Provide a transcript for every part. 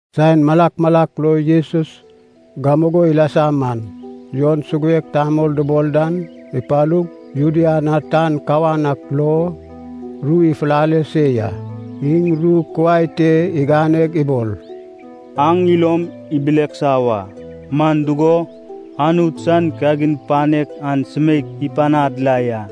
Saen malak malak lo Jesus gamugo ilasa man, Jon suguek tamol dubol dan ipalug, Judea na tan kawan ak lo ru ifulale se ya. Iŋ ru kuai te iganeg ibol, “Aŋ ilom ibileksa wa, man dugo, Anut san kagin panek an sumeik ipanad la ya.”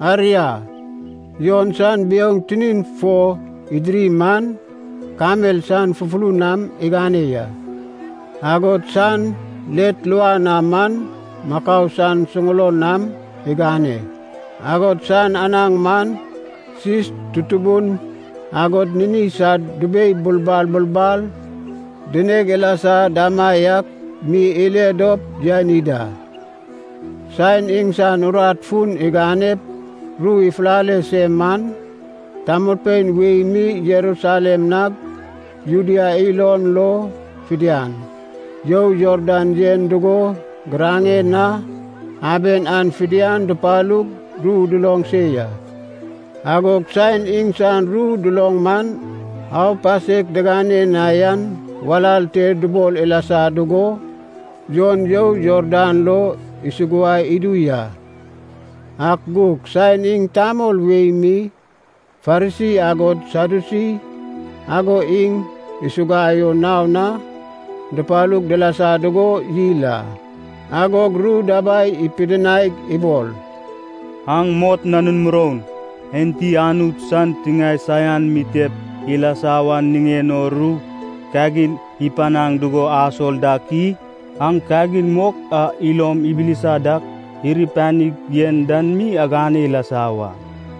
Aria, Jon san biouŋ tinin fo idiri man kamel san fufulun nam igane ya. Agod san let luan na man makau san suŋulon nam igane, agod san anaŋ man sis tutubun agod nini sad dubei bulbal bulbal dineg ilasa damaiak mi ile dop yani da. Saen iŋsan urat fun iganep ru ifulale se man, tamolpein wei mi Jerusalem nag Judea ilon lo fidian, you Jordan yen dugo giraŋen na aben an fidian dupalug ru duloŋ se ya. Agog saen iŋsan ru duloŋ man aupasek digane na yan walal te dubol ilasa dugo, Jon you Jordan lo isuguai idu ya. Ak gug saen iŋ tamol wei mi Farisi agod Sadyusi ago iŋ isuguai o naon na dupalug dilasa dugo yil a, agog ru dabai ipidinaig ibol, “Aŋ mot nanun moroun! Enti Anut san tiŋae saian mitep ilasa wan niŋen o ru kagin ipanaŋ dugo asol dak i? Aŋ kagin mok a ilom ibilisa dak iri panig yen dan mi agane ilasa wa.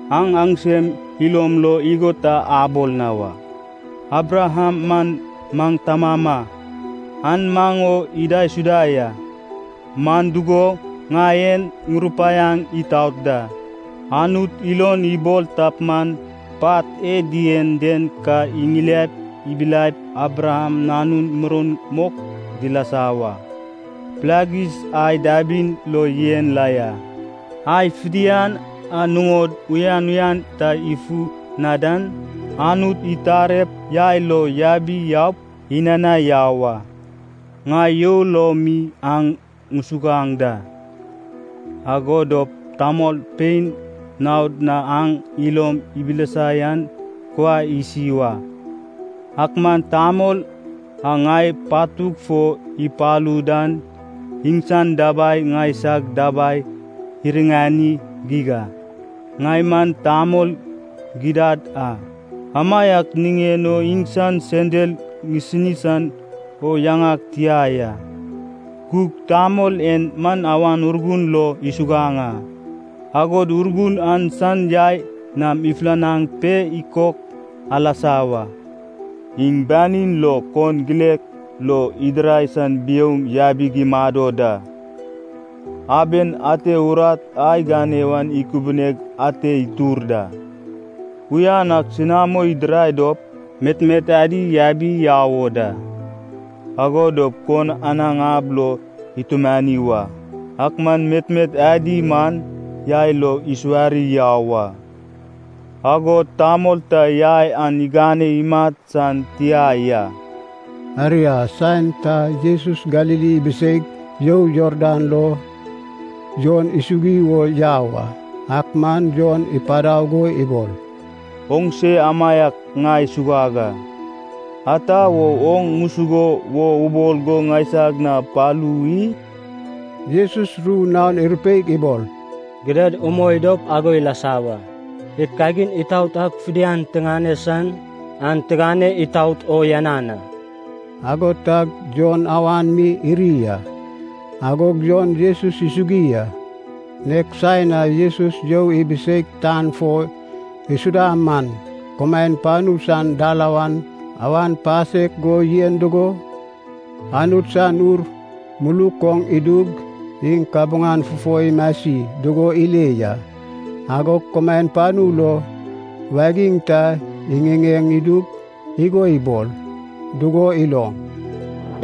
Aŋ aŋsem ilom lo igo ta abol na wa, ‘Abraham man maŋ tamama, an maŋ o idaisuda ya.’ Man dugo, ŋai en ŋurupaiaŋ itaot da, Anut ilon ibol tap man, pat e dien den ka iŋiliaip ibilaip Abraham nanun muroun mok dilasa wa. Pilagis ai dabin lo yen la ya. Ai fidian a nuŋod uyan uyan ta ifu na dan, Anut itarep yai lo yabi yaup inanai yau a. “Ŋai you lo mi aŋ ŋusuguaŋ da, ago dop tamolpein naod na aŋ ilom ibilisa yan kuai isi wa. Ak man tamol a ŋai patug fo ipalu dan iŋsan dabai ŋaisag dabai iriŋani geig a. Ŋai man tamol gidad a, amaiak niŋen o iŋsan sendal ŋisini san o yaŋag tia ya. Gug tamol en man Awan Urgun lo isuguaŋ a, agod Urgun an san yai nam ifulanaŋ pe ikok alasa wa. Iŋ banin lo kon gilek lo idirai san biouŋ yabig imado da. Aben ate urat a igane wan ikubineg ante itur da. Uyan ak senamo idirai dop, metmet adi yabi yau o da. Ago dop kon anaŋ ab lo itumani wa. Ak man metmet adi man yai lo isuwari yau a. Agod tamol ta yai an igane imat san tia ya.” Aria saen ta Jesus Galili ibiseig you Jordan lo Jon isugui wo yau a. Ak man Jon ipadau go ibol, “Oŋse amaiak ŋai suguag a. Ata wo oŋ ŋusuguo wo ubol go ŋaisag na palu i?” Jesus ru naon irupeig ibol, “Gidad umoi dop ago ilasa wa. Id kagin itaot ak fidian tigane san an tigane itout o uyanan a.” Ago tag Jon awan mi iri a. Agog Jon Jesus isugui a. Nek saen a Jesus you ibiseig tan fo isuda man, kumaen panu san dalawan awan pasek go yen dugo, Anut san Ur muluk oŋ idug, iŋ kabuŋan fufo imasi dugo ile ya. Agog kumaen panu lo wagiŋ ta iŋiŋeŋ idug, igo ibol dugo iloŋ,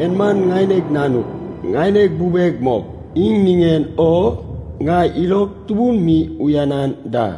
“En man ŋaineg Nanug, ŋaineg bubeg mok, iŋ niŋen o ŋai ilog tubun mi uyanan da.”